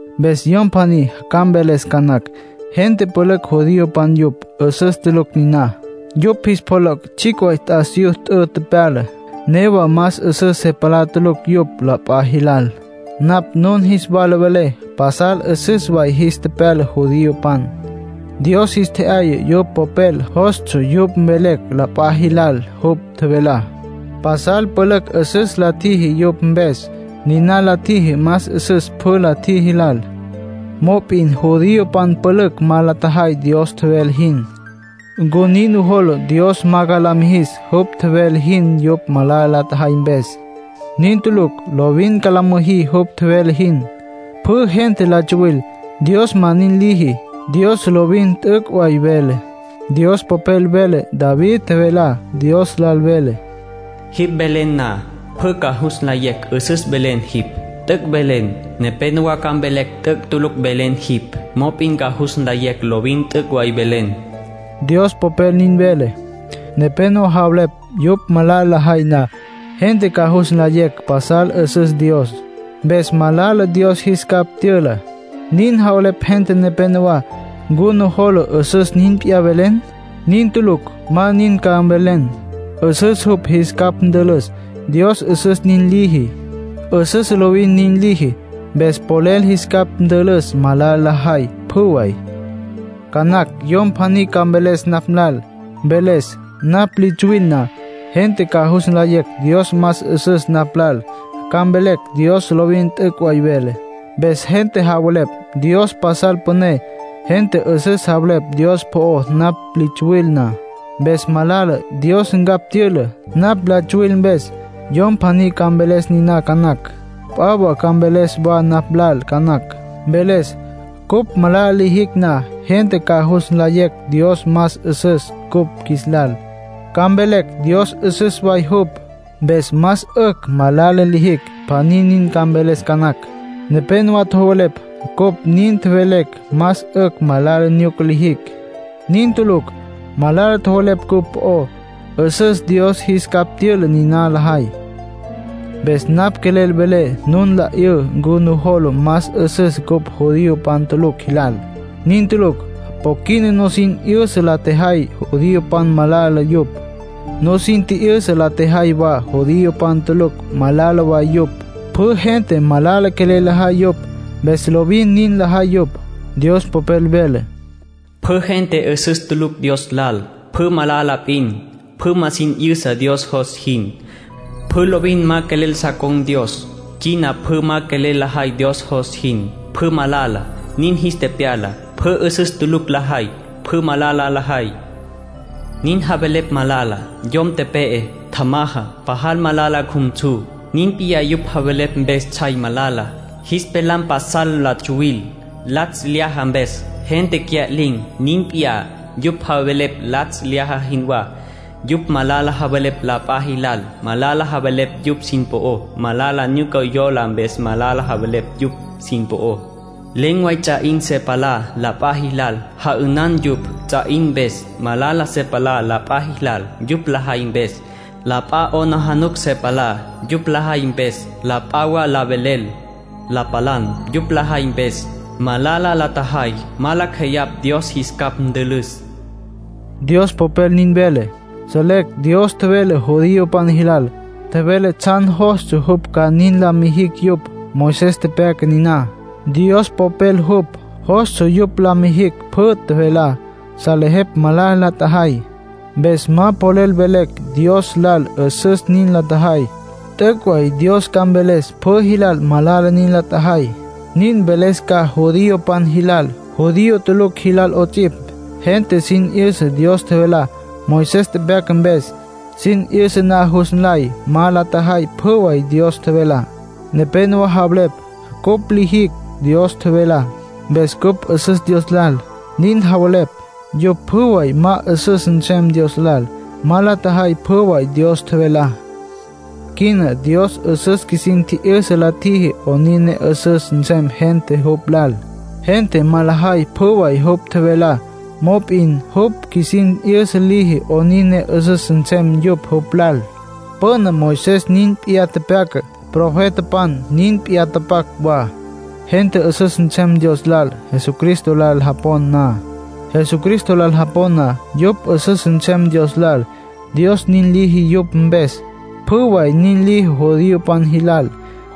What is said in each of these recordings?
Mpes yom pjaní ca mveles ca nacj: “Gente pülücj judiopan yupj. 'Üsüs tulucj niná. Yupj jis pjoloc' tsjicj way t'asiyú t'ü tepyala, newa más 'üsüs se palá tulucj yupj la p'a jilal.” Napj nun jis wala velé pasal 'üsüs way jis tepyala judiopan. Dios jis tje'yaya jupj Popel. Jostsja yupj mvelecj la p'a jilal jupj tjevelá. Pasal pülücj 'üsüs la tjiji yupj mpes; niná la tjiji más 'üsüs pjü la tjiji lal. Mop'in judiopan pülücj ma la tjajay Dios tjevele jin. ¿Ncu nin nujola Dios ma ca la mijis jupj tjevele jin yupj malala la tjajay mpes? Nin tulucj. Lovin ca la mijis jupj tjevele jin. Pjü gente la tsuwil; Dios ma nin liji. Dios lovin t'üc' way vele. Dios Popel vele David tjevelá Dios lal. Vele: “Jipj velen na, pjü ca jus nlayecj 'üsüs velen jipj, t'üc' velen. Nepénowa ca mvelecj t'üc' tulucj velen jipj, mop'in ca jus nlayecj lovin t'üc' way velen”, Dios Popel nin vele. Nepénowa javelepj yupj malala lajay na, gente ca jus nlayecj pasal 'üsüs Dios. Mpes malala Dios qjuis capj tyüla, nin javelepj gente nepenowá. ¿Ncu nujola 'üsüs nin p'iyá velecj? ¡Nin tulucj! Ma nin ca mvelecj. 'Üsüs jupj jis capj ntülüs. Dios 'üsüs nin liji. 'Üsüs lovin nin liji, mpes polel jis capj ntülüs malala lajay, pjü way. Ca nacj yom pjaní ca mveles napj lal. Mveles: “Napj li tsuwil na, gente ca jus nlayecj Dios más 'üsüs napj lal, ca mvelecj Dios lovin t'üc' way vele. Mpes gente javelepj Dios pasal püné. Gente 'üsüs javelepj Dios po'ó napj li tsuwil na. Mpes malala Dios ncapj tyüla, napj la tsyawil mpes”, yom pjaní ca mveles niná ca nacj. P'a wa ca mveles wa napj lal ca nacj. Mveles: “Cupj malala lijicj na, gente ca jus nlayecj Dios más 'üsüs cupj qjuis lal, ca mvelecj Dios 'üsüs way jupj. Mpes más 'ücj malala lijicj”, pjaní nin ca mveles ca nacj. Nepénowa tjowelepj cupj nin tjevelecj más 'ücj malala nyuca lijicj. Nin tulucj. Malala tjowelepj cupj po'ó. 'Üsüs Dios jis capj tyüla niná lajay. Mpes napj quelel nu la 'yüy ncu nujola más 'üsüs cupj judiopan tulucj jilal. Nin tulucj. Po quina nusin tji'yüsa la tjejay judiopan malala yupj. Nusin tji'yüsa la tjejay wa judiopan tulucj malala wa yupj. Pjü gente malala quelel lajay yupj. Mpes lovin nin lajay yupj. Dios Popel vele: “Pjü gente 'üsüs tulucj Dios lal, pjü malala p'in. Pjü ma sin 'yüsa Dios jos jin. Pjü lovin ma quelel so con̈có Dios. Quina pjü ma quelel lajay Dios jos jin. Pjü malala, nin jis tepyala. Pjü 'üsüs tulucj lajay, pjü malala lajay. Nin javelepj malala. Yom tepe'e, tjamaja, pajal malala cjumsu. Nin p'iyá yupj javelepj mpes tsjay malala. Jis pelam pasal la tsuwil. Latsj lyaja mpes, gente cya'lin̈. Nin p'iyá, yupj javelepj latsj lyaja jinwá. Yupj malala javelepj la p'a jilal. Malala javelepj yupj sin po'ó. Malala nyuca yola mpes malala javelepj yupj sin po'ó. Len̈ way ts'a 'in se palá la p'a jilal. Ja'ünan yupj, ts'a 'in mpes. Malala se palá la p'a jilal, yupj lajay mpes. La p'a 'aplijila se palá, yupj lajay mpes. La p'a wa la velel, la palan, yupj lajay mpes. Malala la tjajay. Ma lacj jeyapj Dios jis capj ntülüs”, Dios Popel nin vele. Selecj Dios tjevele judiopan jilal, tjevele tsjan jostsja jupj ca nin la mijicj yupj. Moisés tepyaca niná, Dios Popel jupj. Jostsja yupj la mijicj pjü tjevelá. Salejepj malala la tjajay. Mpes ma polel mvelecj Dios lal 'üsüs nin la tjajay. T'üc' way Dios ca mveles pjü jilal malala nin la tjajay. Nin mveles ca judiopan jilal, judío tulucj jilal 'ots'ipj. Gente sin 'yüsa Dios tjevelá, Moisés tepyaca mpes. Sin 'yüsa na jus nlay ma la tjajay pjü way Dios tjevelá. Nepénowa javelepj: “Cupj lijicj Dios tjevelá, mpes cupj 'üsüs Dios lal”, nin javelepj. Yupj pjü way ma 'üsüs nsem Dios lal; ma la tjajay pjü way Dios tjevelá. Quina Dios 'üsüs qjuisin tji'yüsa la tjiji 'onin ne 'üsüs nsem gentá jupj lal. Gente ma lajay pjü way jupj tjevelá, mop'in jupj qjuisin 'yüsa liji 'onin ne 'üsüs nsem yupj jupj lal. Püna Moisés nin p'iyá tepyaca, profetapan nin p'iyá tapac wa. Gente 'üsüs nsem Dios lal Jesucristo lal japon na. Jesucristo lal japon na, yupj 'üsüs nsem Dios lal, Dios nin liji yupj mpes, pjü way. Nin liji judiopan jilal,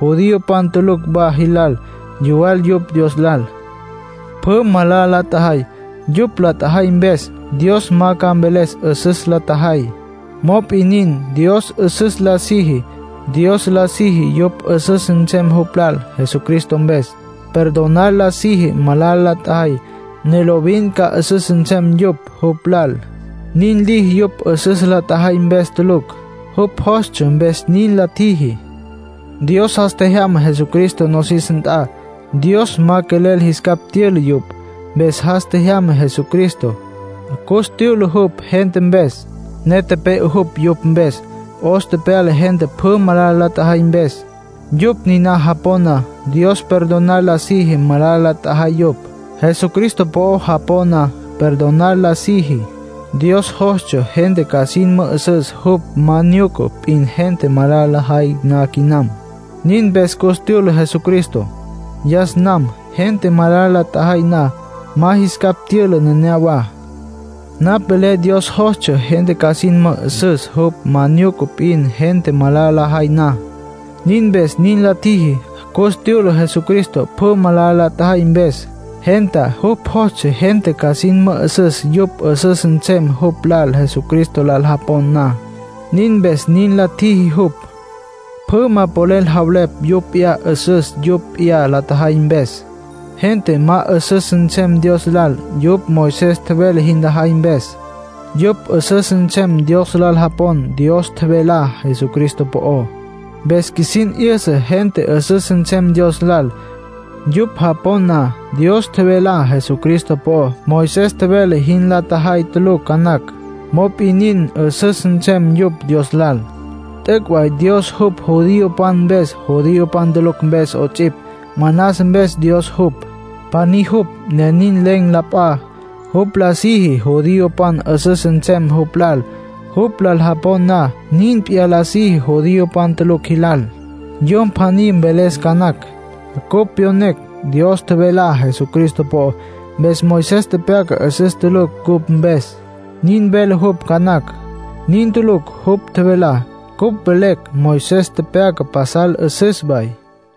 judiopan tulucj wa jilal. Yuwal yupj Dios lal. Pjü malala la tjajay. Yupj la tjajay mpes Dios ma ca mveles 'üsüs la tjajay. Mop'in nin, Dios 'üsüs la siji. Dios la siji yupj 'üsüs nsem jupj lal Jesucristo mpes. Perdonar la siji malala la tjajay, ne lovin ca 'üsüs nsem yupj jupj lal. Nin liji yupj 'üsüs la tjajay mpes tulucj; jupj jostsja mpes nin la tjiji. Dios jas tjejyama Jesucristo nosis nt'a. Dios ma quelel jis capj tyüla yupj, mpes jas tjejyama Jesucristo. Cus tyüla jupj gente mpes, ne tepe'e jupj yupj mpes. 'Os tepyala gente pjü malala la tjajay mpes. Yupj niná japon na, Dios perdonar la siji malala la tjajay yupj. Jesucristo po'o japon na, perdonar la siji. Dios jostsja gente ca sin mü'üsüs jupj ma nyuca p'in gente malala lajay na quinam, nin mpes cus tyüla Jesucristo. Yas nam, gente malala la tjajay na, ma jis capj tyüla neneyawá. Napj velé Dios jostsja gente ca sin mü'üsüs jupj ma nyuca p'in gente malala lajay na, nin mpes nin la tjiji. Cus tyüla Jesucristo, pjü malala la tjajay mpes, gentá. Jupj jostsja gente ca sin mü'üsüs yupj 'üsüs nsem jupj lal Jesucristo lal japon na; nin mpes nin la tjiji jupj. Pjü ma polel javelepj yupj p'iyá 'üsüs, yupj p'iyá la tjajay mpes. Gente ma 'üsüs nsem Dios lal yupj Moisés tjevele jin lajay mpes. Yupj 'üsüs nsem Dios lal japon na Dios tjevelá Jesucristo po'ó. Mpes qjuisin 'yüsa gente 'üsüs nsem Dios lal, yupj japon na Dios tjevelá Jesucristo po'ó. Moisés tjevele jin la tjajay tulucj ca nacj; mop'in nin, 'üsüs nsem yupj Dios lal. T'üc' way Dios jupj judiopan mpes, judiopan tulucj mpes 'ots'ipj. Manas mpes Dios jupj, pjaní jupj, ne nin; len̈ p'a. Jupj la siji judiopan 'üsüs nsem jupj lal, jupj lal japon na. Nin p'iyá la siji judiopan tulucj jilal. Yom pjaní mveles ca nacj: “Cupj pyonecj Dios tjevelá Jesucristo po'ó. Mpes Moisés tepyaca 'üsüs tulucj cupj mpes”, nin vele jupj ca nacj. Nin tulucj jupj tjevelá. Cupj velecj Moisés tepyaca pasal 'üsüs way.